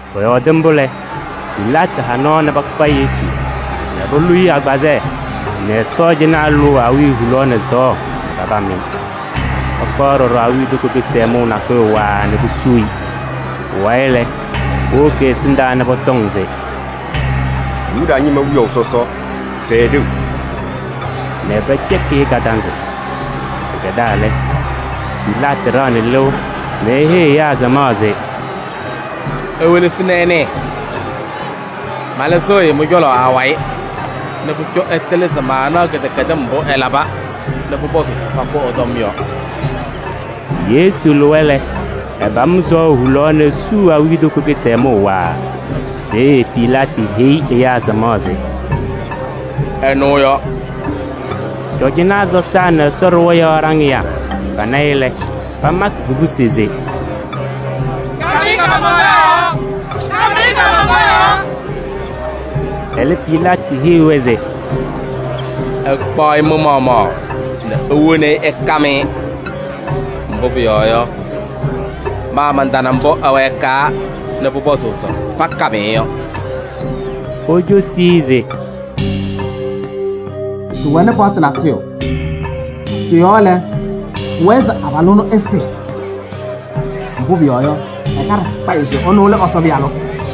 Pɔyɔɔdɩ mbʋ lɛ, Pilaatɩ ha nɔɔ nɛ pakpa Yesu nɛ polu-i agbazɛɛ nɛ sɔɔjanaa lʋʋ awiya hulaɣ nɛ sɔɔ nɛ papam-ɩ. Pakpaɣ ɖɔɖɔ awiitoko kɩsɛmʋʋ nakʋyʋ waaa nɛ posuu-i. Pʋwayɩ lɛ, powoki ɛ-ɛsɩndaa nɛ pɔtɔŋ se: “Yuda ñɩma wiyaʋ sɔsɔ! Sɛɛ ɖeu!” Nɛ pɛcɛkɩ-ɩ kadanzɩ. Pɩkɛdaa lɛ, Pilaatɩ ɖaɣnɩ lɩʋ nɛ eheyi ɛyaa samaɣ se: “Iwelesi nɛ ɩnɩɩ, malɩzɩɣ-ɩ mɩ-cɔlɔ awayɩ nɛ pʋcɔ ɩtɩlɩ se maanaɣ kɩdɛkɛdɩm mbʋ ɛlaba nɛ pʋpɔzʋʋ se pakʋ ɛ-tɔm yɔ.” Yesu lɩwa lɛ, ɛpam sɔɔ hulaɣ nɛ esuu awiitoko kɩsɛmʋʋ waaa. Peeye Pilaatɩ heyi ɛyaa samaɣ se: “Ɛnʋ yɔ!” Cɔjɔnaa sɔsaa nɛ Ɛsɔ ɖɩɣa yɔɔ ɖaŋɩyaa pana-ɩ lɛ, pamakɩ kobusi se: “Kam-ɩ kaamaŋkaɣ yɔɔ! Kam-ɩ kaamaŋkaɣ yɔɔ!” Ɛlɛ Pilaatɩ heyi-wɛ se: “Ɩkpaɣ-ɩ mɩ-maɣmaɣ nɛ iwoni-i ɩkam-ɩ. Mbʋ pʋyɔɔ yɔ, ma mantana mbʋ ɛwɛɛkaa nɛ pʋpɔzʋʋ se pakam-ɩ yɔ.” Pocosi-i se: “Ɖɩwɛnɩ paɣtʋ natʋyʋ, tɩ-yɔɔ lɛ, pʋwɛɛ se abalʋ ɛnʋ ɛsɩ. Mbʋ pʋyɔɔ yɔ, ɛkaɖɩ kpayɩ se ɛnʋ lɛ Ɛsɔ Pɩyalʋ.”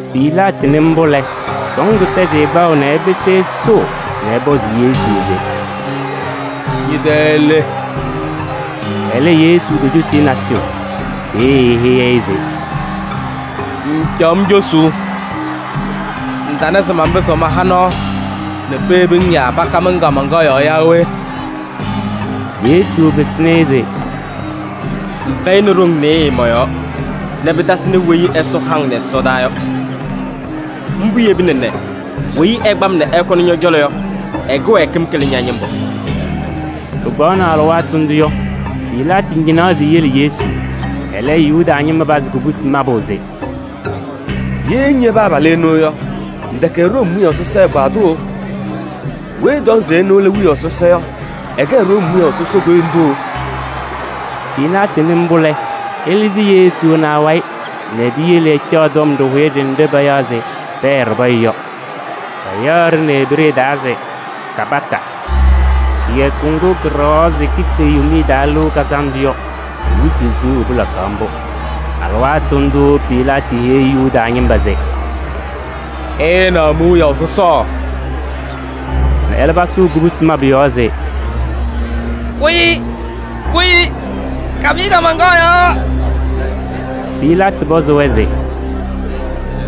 Pilaatɩ nɩ mbʋ lɛ, sɔɔndʋ tɛzɩ-ɩ kpaʋ nɛ ɛpɩsɩ ɛsʋʋ nɛ ɛpɔzɩ Yesu se: “Ñɛ-tɛ le?” Ɛlɛ, Yesu tocosi-i natʋyʋ. Peeye eheyi-i se: “Ŋŋcaɣ-m cosuu? Ŋtana se manpɩzɩɣ maha nɔɔ nɛ peyebi-ŋ yaa pakam-ŋ kaamaŋkaɣ yɔɔ yaa we?” Yesu pɩsɩnɩ-ɩ se: “Ŋfɛyɩnɩ ɖoŋ nɩɩyɩ mɔ-yɔɔ nɛ pɩtasɩnɩ weyi Ɛsɔ ha-ŋ nɛ ɛsɔdaa yɔ. Mbʋ yebina nɛ weyi ɛkpa-m nɛ ɛkɔnɩ ñɔ-cɔlɔ yɔ, ɛ-kɩwɛɛkɩm kɩlɩ ña-ñɩmbʋ.” Pɩkpaɣʋ nɛ alɩwaatʋ ndʋ yɔ, Pilaatɩ ñɩnaɣ se eyele Yesu. Ɛlɛ, Yuda ñɩma pazɩ kubusi mabʋ se: “Ye ŋyebi abalʋ ɛnʋ yɔ, ŋtɛkɛ Room wiyaʋ sɔsɔ ɛgbaadʋ! Weyi ɛtɔŋ se ɛnʋ lɛ wiyaʋ sɔsɔ yɔ, ɛkɛ Room wiyaʋ sɔsɔ koyindu!” Pilaatɩ nɩ mbʋ lɛ, ɛlɩzɩ Yesu nɛ awayɩ nɛ piyele ɛcaɣ tɔm ɖɩhʋyɛ ɖenɖe payaɣ se Pɛɛ Ɖɩpɔyɛ yɔ. Payaɣ-ɖɩ nɛ Ebree taa se Gabata. Kɩyakʋ ŋgʋ kɩɖɛɣaɣ se kife Yomiye Taa Lɩʋ Kazandʋ yɔ, kɩ-wɩsɩ siɣu pɩlakaɣ mbʋ. Alɩwaatʋ ndʋʋ Pilaatɩ heyi Yuda ñɩma se: “Ɩɩnaɣ mi-wiyaʋ sɔsɔ!” Ɛlɛ, pasʋʋ kubusi mabʋ yɔɔ se: “Kʋ-ɩ! Kʋ-ɩ! Kam-ɩ kaamaŋkaɣ yɔɔ!” Pilaatɩ pɔzɩ-wɛ se: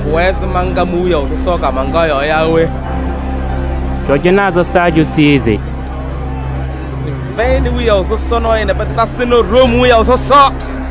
“Pʋwɛɛ se manka mi-wiyaʋ sɔsɔ kaamaŋkaɣ yɔɔ yaa we?” Cɔjɔnaa sɔsaa cosi-i se: “Ɖɩfɛyɩnɩ wiyaʋ sɔsɔ nɔɔyʋ nɛ pɩtasɩnɩ Room wiyaʋ sɔsɔ.”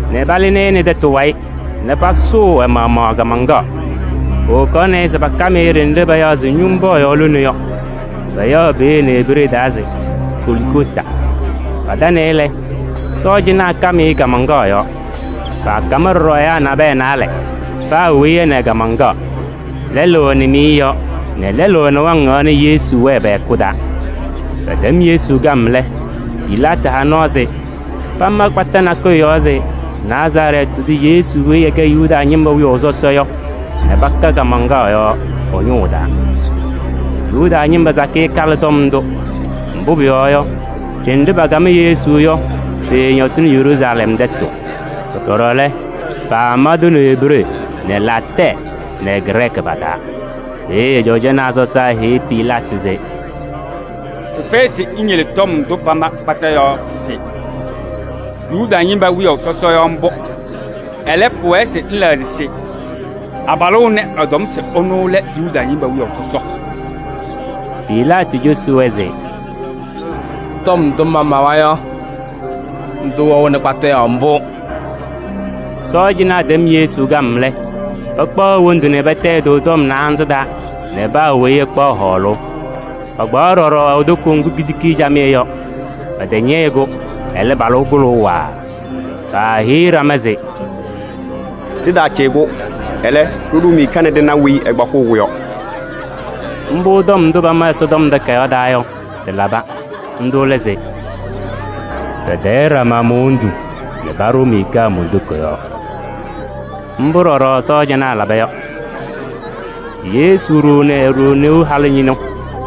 nɛ palɩzɩ-ɩ nɛ tɛtʋ wayɩ nɛ pasʋʋ ɛ-maɣmaɣ kaamaŋkaɣ. Powokaɣnɩ-ɩ se pakam-ɩ ɖenɖe payaɣ se Ñʋmbɔɔyaɣ lone yɔ. Payaɣ peeye nɛ Ebree taa se Goligota. Patanɩ-ɩ lɛ, sɔɔjanaa kam-ɩ kaamaŋkaɣ yɔɔ. Paakam ɖɔɖɔ naalɛ nabɛyɛ, paa weyi nɛ ɛ-kaamaŋkaɣ: lɛlʋ ɛ-nɩmɩyɛ yɔɔ nɛ lɛlʋ ɛ-nɩwaŋ yɔɔ nɛ Yesu wɛɛ pɛ-hɛkʋ taa. Pɛtɛm Yesu kam lɛ, Pilaatɩ ha nɔɔ se pama kpata nakʋyʋ yɔɔ se: “Nazarɛɛtɩ tʋ Yesu weyi ɛkɛ Yuda ñɩma wiyaʋ sɔsɔ” yɔ nɛ paka kaamaŋkaɣ yɔɔ ɛ-ñʋʋ taa. Yuda ñɩma sakɩyɛ kalɩ tɔm ndʋ. Mbʋ pʋyɔɔ yɔ, ɖenɖe pakam Yesu yɔ, pɩɩñɔtɩnɩ Yeruusalɛm tɛtʋ. Ɖɔɖɔ lɛ, paama-tʋ nɛ Ebree nɛ Laatɛɛ nɛ Grɛɛkɩ pa-taa. Peeye cɔjɔnaa sɔsaa heyi Pilaatɩ se: “Pɩfɛyɩ se ŋyele tɔm ndʋ pama kpata yɔɔ se: ‘Yuda ñɩma wiyaʋ sɔsɔ’ yɔ mbʋ. Ɛlɛ, pʋwɛɛ se ŋlɛɣzɩ se: ‘Abalʋ ɛnɛ, ɛtɔm se ɛnʋ lɛ Yuda ñɩma wiyaʋ sɔsɔ.’” Pilaatɩ cosi-wɛ se: “Tɔm ndʋ mamawa yɔ, ndʋ wɛɣnɩ kpata yɔɔ mbʋ.” Sɔɔjanaa tɛm Yesu kam lɛ, pakpaɣ e-wondu nɛ patayɩ tɔm naanza taa nɛ paa weyi ɛkpaɣ hɔɔlʋʋ. Pakpaɣ ɖɔɖɔ e-toko ŋgʋ kitiki-i camɩyɛ yɔ. Pɛtɛñɛyɩ-kʋ, ɛlɛ, palʋ-kʋ kʋlʋʋ waaa. Paaheyi ɖama se: “Ɖɩtaacɩyɩ-kʋ, ɛlɛ, ɖɩɖʋ miika nɛ ɖɩna weyi ɛkpakɩɣ-kʋ yɔ.” Mbʋ tɔm ndʋ pama Ɛsɔtɔm Takayaɣ taa yɔ, tɩlaba. Ndʋ lɛ se: “Patayɩ ɖama mon-wondu nɛ paɖʋ miika mon-toko yɔɔ.” Mbʋ ɖɔɖɔ sɔɔjanaa laba yɔ. Yesu ɖoo nɛ e-ɖoo neu halʋ ñɩnʋ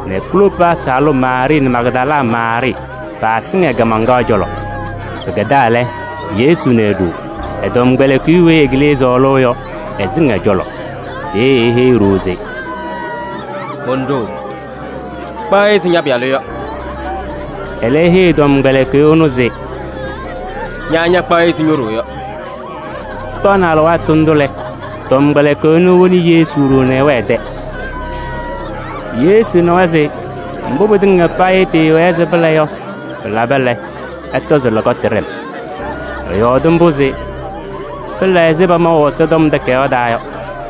nɛ Kloopaasɩ halʋ Maarɩɩ nɛ Magdala Maarɩɩ paasɩŋ ɛ-kaamaŋkaɣ cɔlɔ. Pɩkɛdaa lɛ, Yesu na e-ɖoo, ɛ-tɔmkpɛlɩkɩyʋ weyi ɛkɩlɩ sɔɔlʋʋ yɔ, ɛsɩŋ ɛ-cɔlɔ. Peeye eheyi e-ɖoo se: “Mon-ɖoo! Kpaɣ-ɩ ɛzɩ ña-pɩyalʋ yɔ.” Ɛlɛ eheyi tɔmkpɛlɩkɩyʋ ɛnʋ se: “Ña ñakpaɣ-ɩ ɛzɩ ño-ɖoo yɔ.” Pɩkpaɣ alɩwaatʋ ndʋ lɛ, tɔmkpɛlɩkɩyʋ ɛnʋ, ewoni Yesu ɖoo nɛ ɛwɛɛ ɛ-tɛ. Yesu nawa se mbʋ pɩtɩŋa payɩ pɩɩwɛɛ se pɩla yɔ, pɩlaba lɛ, ɛtɔ se lɔkɔtʋ ɖɛ-m. Ɛyɔɔdɩ mbʋ se pɩla ɛzɩ pamaʋ Ɛsɔtɔm Takayaɣ taa yɔ.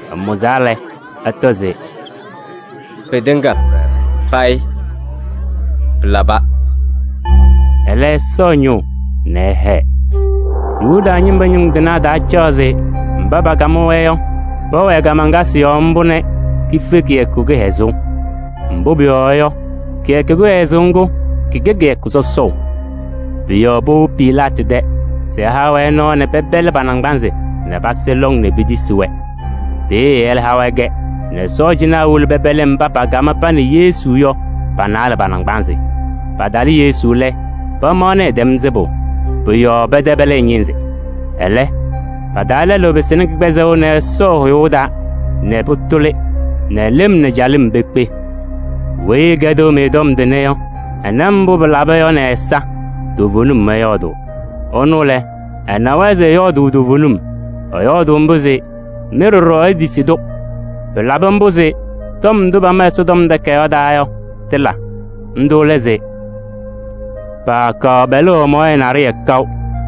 Ɛmʋzaa lɛ, ɛtɔ se: “Pɩtɩŋa payɩ pɩlaba!” Ɛlɛ ɛsɔ ñʋʋ nɛ ɛhɛɛ. Yuda ñɩma ñʋŋ tɩnaa taacaɣ se mba pakam-wɛ yɔ, pɛwɛɛ kaamaŋkasɩ yɔɔ mbʋ nɛ kife kɩyakʋ kɩhɛzʋʋ. Mbʋ pʋyɔɔ yɔ, kɩyakʋ kɩhɛzʋʋ ŋgʋ, kɩkɛ kɩyakʋ sɔsɔʋ. Pʋ-yɔɔ powobi Pilaatɩ tɛ se ɛha-wɛ nɔɔ nɛ pɛpɛlɩ pa-naŋgbanzɩ nɛ pasɩ lɔŋ nɛ petisi-wɛ. Peeye ɛha-wɛ-kɛ nɛ sɔɔjanaa wolo pɛpɛlɩ mba pakam pa nɛ Yesu yɔ, pa-naalɛ pa-naŋgbanzɩ. Patalɩ Yesu lɛ, pamaɣnɩ ɛtɛm sɩbʋ. Pʋ-yɔɔ pɛtɛpɛlɩ ɛ-ñɩnzɩ. Ɛlɛ, pa-taa lɛlʋ pɩsɩnɩ kɩgbɛzɛŋ nɛ ɛsɔ ɛ-hʋyʋʋ taa nɛ pʋtʋlɩ nɛ lɩm nɛ calɩm pekpe. Weyi ɛkɛdɩɣ-mɩ tɔm tʋnɛ yɔ, ɛna mbʋ pɩlaba yɔ nɛ ɛ-ɛza, toovenim ɛyɔɔdʋʋ. Ɛnʋ lɛ, ɛnawa se ɛyɔɔdʋʋ toovenim. Ɛyɔɔdʋʋ mbʋ se mɩ ɖɔɖɔ itisi-tʋ. Pɩlabɩ mbʋ se tɔm ndʋ pama Ɛsɔtɔm Takayaɣ taa yɔ, tɩla. Ndʋ lɛ se: “Paakaɣ pɛlʋʋ ɛ-mɔɔyɛ naɖɩyɛ kaʋ.”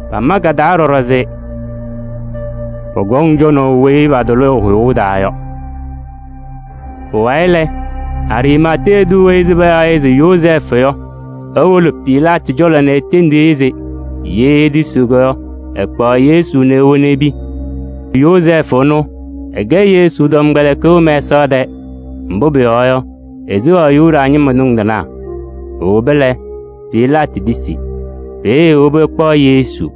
Pama ka-taa ɖɔɖɔ se: “Pɔkɔŋ cɔnaʋ weyi patʋlɩ ɛ-hʋyʋʋ taa yɔ.” Pʋwayɩ lɛ, Ariimatee tʋ weyi payaɣ se Yozɛɛfʋ yɔ, ewolo Pilaatɩ cɔlɔ nɛ etendi-i se ye etisiɣ yɔ, ɛkpaɣ Yesu nɛ ewoni epi. Yozɛɛfʋ ɛnʋ, ɛkɛ Yesu tɔmkpɛlɩkɩyʋ mɛsaɣ tɛɛ. Mbʋ pʋyɔɔ yɔ, eseɣaɣ Yuda ñɩma ñʋŋ tɩnaa. Ewoba lɛ, Pilaatɩ tisi. Peeye ewobi ɛkpaɣ Yesu.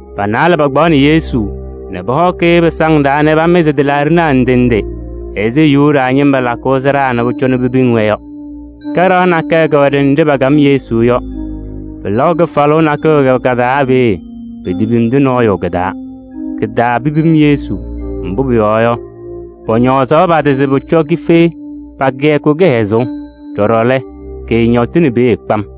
Pa-naalɛ pakpaɣnɩ Yesu nɛ pɔhɔkɩ-ɩ pɩsaŋ taa nɛ pamɩzɩ tɩlaaɖɩnaa ndɩ ndɩ ɛzɩ Yuda ñɩma lakʋʋ sɩɖaa nɛ pʋcɔ pepiŋ-wɛ yɔ. Kaɖaɣ nakɛyɛ kɛwɛ ɖenɖe pakam Yesu yɔ. Pɩlaʋ kɩfalʋʋ nakʋyʋ kɛwɛ ka-taa peeye, petepimdi nɔɔyʋ kɩ-taa. Kɩ-taa pepim Yesu, mbʋ pʋyɔɔ yɔ, pɔñɔɔzaɣ pa-tɩ se pʋcɔ kife pa-kɩyakʋ kɩhɛzʋʋ. Ɖɔɖɔ lɛ, kɩɩñɔtɩnɩ peeye kpam.